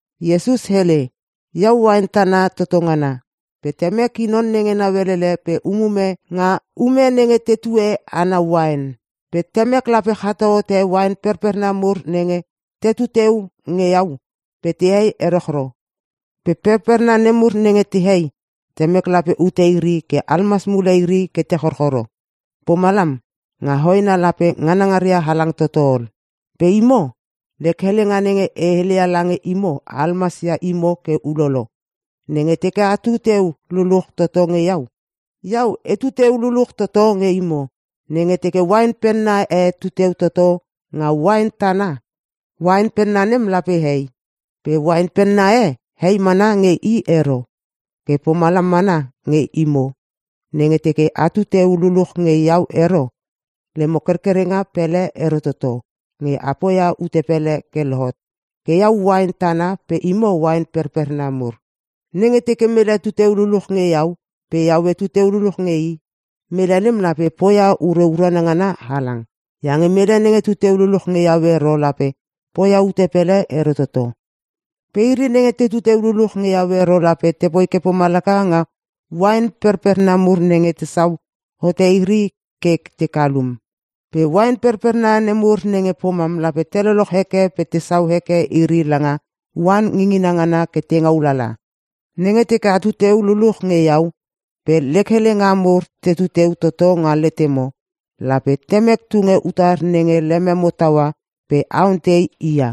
Iesus hele, “Iau uain tana toto ngana. Pe Temek i non nenge nauelele pe umume nga ume nenge tetue ana uain. Pe Temek lape chato hote uain perperna mur nenge tetu teu nge iau pe tehei erochro. Pe perperna nemur nenge tehei, Temek lape ute iri ke almas mule iri ke te chorchoro. Pomalam, nga hoena lape nganangaria halang toto ol. Pe imo, lek helenga nenge e heleia lange imo almasia imo ke ulolo. Nenge teke atu teu luluch toto nge iau, iau etu teu luluch toto nge imo. Nenge teke uain penna e tuteu toto nga uain tana, uain penna nem lape hei. Pe uain penna e hei mana nge i ero. Ke pomalam mana nge imo, nenge teke atu teu luluch nge iau ero, lemo kerkerenga pele ero toto nge a poia ute pele ke lohot. “Ke iau uain tana pe imo uain perperna mur. Nenge teke mele tu teu luluch nge iau pe iau etu teu luluch nge i, mele nem lape poia ure urana ngana halang. Iange mele nenge tu teu luluch nge iau ero lape poia ute pele ero toto. Pe iri nenge tetu teu luluch nge iau ero lape tepoi ke pomalaka nga uain perperna mur nenge tesau hote iri ke te kalum. Pe uain perperna nemur nenge pomam lape te lochloch heke pe tesau heke iri langa oan ngingina ngana ke te ngaulala. Nenge teke atu teu luluch nge iau pe lek helenga mur tetu teu toto nga letemo, lape Temek tunge utar nenge lememo taua pe a ontei i ia.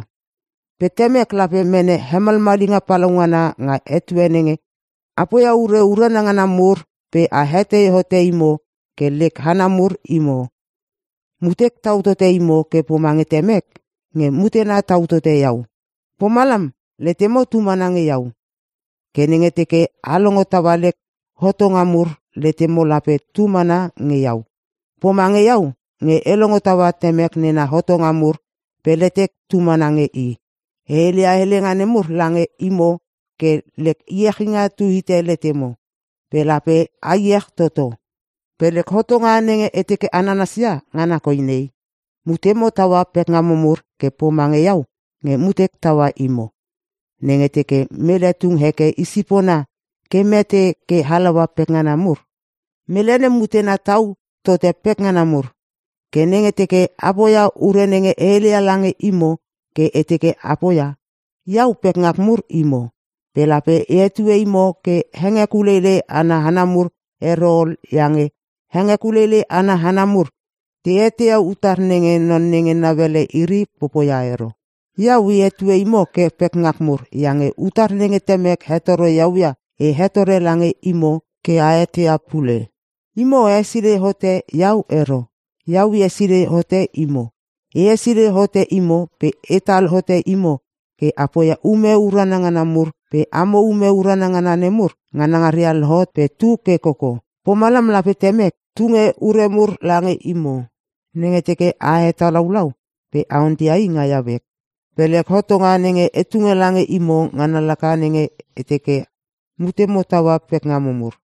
Pe Temek lape mene hemalmalinga palaungana nga etue nenge a poia ure urana ngana mur pe a hetei hote imo ke lek hana mur imo. “Mutek tau tote imo ke pomange Temek nge mutena tau tote iau. Pomalam, letemo tu mana nge iau. Ke nenge teke a longo taua lek hotonga mur letemo lape tu mana nge iau. Pomange iau nge e longo taua Temek nena hotonga mur pe letek tu mana nge i. E heleia helenga nemur lange imo ke lek iechinga tu hite letemo. Pe lape a iech toto. Pe lek hotonga nenge e teke a nanasia ngana koi nei; Mutemo taua pekngamo mur ke pomange iau nge mutek taua imo. Nenge teke mele tung heke i sipona ke mete ke halaua pekngana mur, mele nem mutena tau tote pekngana mur. Ke nenge teke a poia ure nenge e heleia lange imo ke e teke a poia, iau pekngak mur imo. Pe lape e hetue imo ke hengekuleilei ana hana mur ero ol iange hengekuleilei ana hana mur te eteia utar nenge non nenge nauele iri popoia ero. Iau e hetue imo ke pekngak mur iange utar nenge Temek hetoro iau ia e hetore lange imo ke a eteia pule. Imo a hesilei hote iau ero, iau e hesilei hote imo. E hesilei hote imo pe etal hote imo ke a poia ume urana ngana mur pe amo ume urana ngana nemur nganangana lohot pe tu ke koko. Pomalam lape Temek tunge ure mur lange imo nenge teke a hetalaulau pe a onteia i nga iau ek. Pe lek hotonga nenge e tunge lange imo ngana laka nenge e teke mutemo taua pekngamo mur.”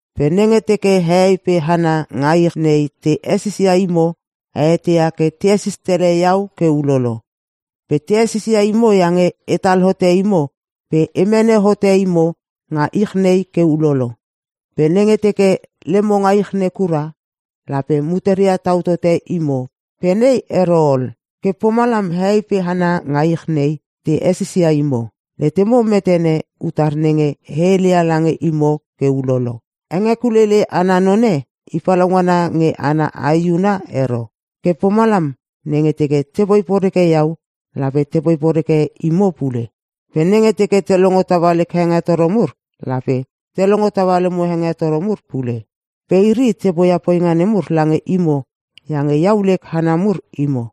“Pe nenge teke hehei pe hana nga ich nei te hesisia imo a eteia ke te hesis tele iau ke ulolo. Pe te hesisia imo iange etal hote imo pe e mene hote imo nga ich nei ke ulolo. Pe nenge teke lemo nga ich nei kura lape muteria tau tote imo pe nei ero ol. Ke pomalam hehei pe hana nga ich nei te hesisia imo. Letemo metene utar nenge e heleia lange imo ke ulolo. ‘Hengekuleilei ana none i palaungana nge ana aehuna ero.’ Ke pomalam nenge teke tepoi poreke iau lape tepoi poreke imo pule. Pe nenge teke te longo taua lek hengetoro mur lape te longo taua lemo hengetoro mur pule. Pe iri te poia poinga nemur lange imo iange iau lek hana mur imo.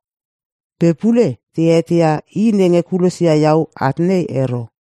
Pe pule te eteia i nenge kulosia iau at nei ero.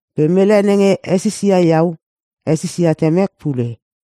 Pe mele nenge hesisia iau hesisia Temek pule.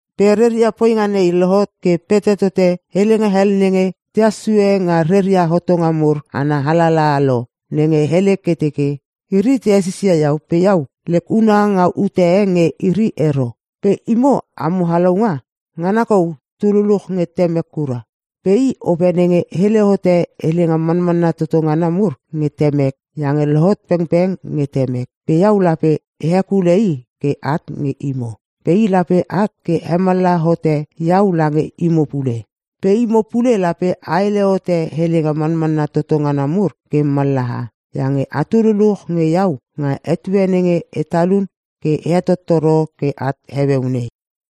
Pe reria poinga nei lohot ke pete tote helenga hel nenge tehas sue nga reria hotonga mur ana alalaha lo nenge hele ke teke, ‘Iri te hesisia iau pe iau lek huna nga ute e nge iri ero.’ “Pe imo amo Halaunga, ngana kou tu luluch nge Temek kura. Pe i Ope nenge hele hote helenga manmanna toto ngana mur nge Temek iange lohot pengpeng nge Temek. Pe iau lape e hekule i ke at nge imo. Pe i lape at ke hemallaha hote iau lange imo pule. Pe imo pule lape a hele hote helenga manmanna toto ngana mur ke mallaha, iange atu luluch nge iau nga etue nenge e talun ke e hetottoro ke at heueu nei.